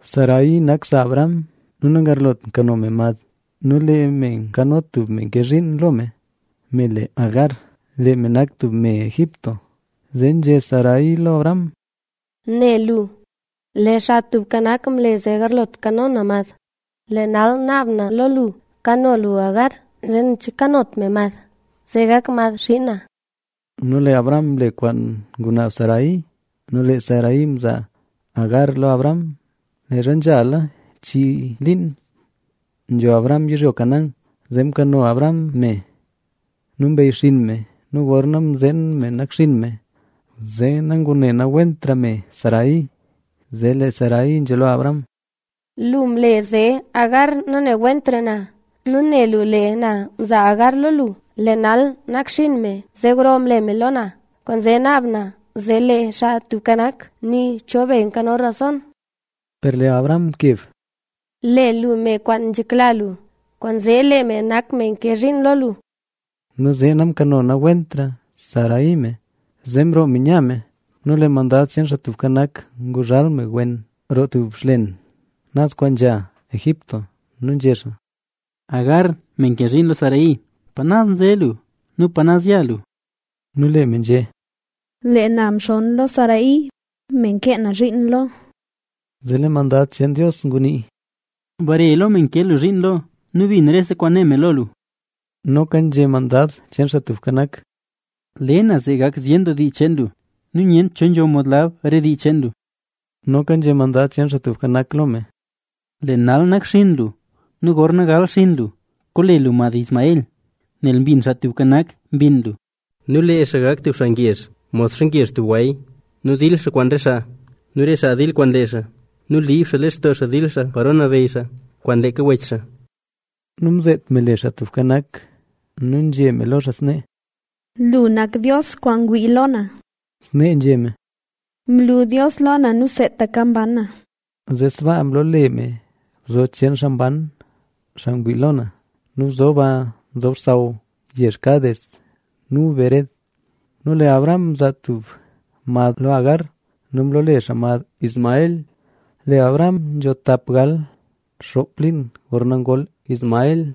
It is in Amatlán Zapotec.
Sarai nak sa Abram nu nagarlot kano me mad. Nu lee me nkano tub me nke zhiin lo me, me le Agar. Lee me nak tub me Egipto. Zee nzhé Sarai lo Abram: —Ne lu, lee Xaa Tubka Nak mle zee nagarlot kano na mad. Lee nal naab na lo lu, kano lu Agar, zee nen che nakanot me mad, zee gak mad xiin na. Nu lee Abram mle kwaan ngunaab Sarai. Nu lee Sarai mzaa Agar lo Abram, leezha nzhala chii liin nzho Abram yizhyo Canaán. Zee mkano Abram me nu mbeyxinn me. Nu gorna mzeen me nakxinn me, zee nangunewentra me Sarai. Zee lee Sarai nzhé lo Abram: —Lu mle zee Agar nanewentra na. Nu ne lu lee na mza Agar lo lu. Lee nal nakxinn me, zee gro nle me lo na. Kwaanzee naab na zee lee Xaa Tubka Nak, nii cho be nkano rason. Per lee Abram mkeb: —Le lu me kwaan nzhekla lu, kwaanzee lee me nak me nke zhiin lo lu. Nu zee namkano nawentra Sarai me. Zee mroo me nya me. Nu lee Mandada cheen Xaa Tubka Nak nguzhal me wen, roo tub xlen, naz kwaan nzha Shur. Nu nzhé xaa: —Agar, me nke zhiin lo Sarai, ¿pa naz nze lu? Nu ¿pa naz ya lu? Nu lee me nzhé: —Lee na mxonn lo Sarai, me nke na zhiin lo. Zee lee mandad cheen Dios ngunii: —Bare lo me nke lu zhiin lo nu bin rese kwaan né me lo lu. Noka nzhé Mandad cheen Xaa Tubka Nak: —Le na zee gak zyen doo dii cheen lu nu nyent cho nzho mod lab re dii cheen lu. Noka nzhé Mandad cheen Xaa Tubka Nak lo me: —Lee nal nakxinn lu nu gorna gal xinn lu, koole lu mad Ismael,b nel mbin Xaa Tubka Nak mbinn lu. Nu lee xaa gak tub xaa ngezh, modxa ngezh tub gway. Nu dil xaa kwaan re xaa nu re xaa dil kwaan lee xaa. Nu liib xaa lextoo xaa dil xaa paro nabeyy xaa kwaan leeka wech xaa. Nu mzeet me le Xaa Tubka Nak nu nzhé me lo xaa snee: “Lu nak Dios kwaan ngwii lo na”. Snee nzhé me: “¡Mlu Dios lo na nu seetaka mban na!” Zee sbaa mloole me bzo, “Bzo cheen Xaa Mban, xaa ngwii lo na”. Nu bzo ba nzob xsaw yezh Cades nu Bered. Nu lee Abram mzaa tub mad lo Agar. Nu mloole xaa mad Ismael. Lee Abram nzho tap gal xoop liin gorna ngol Ismael.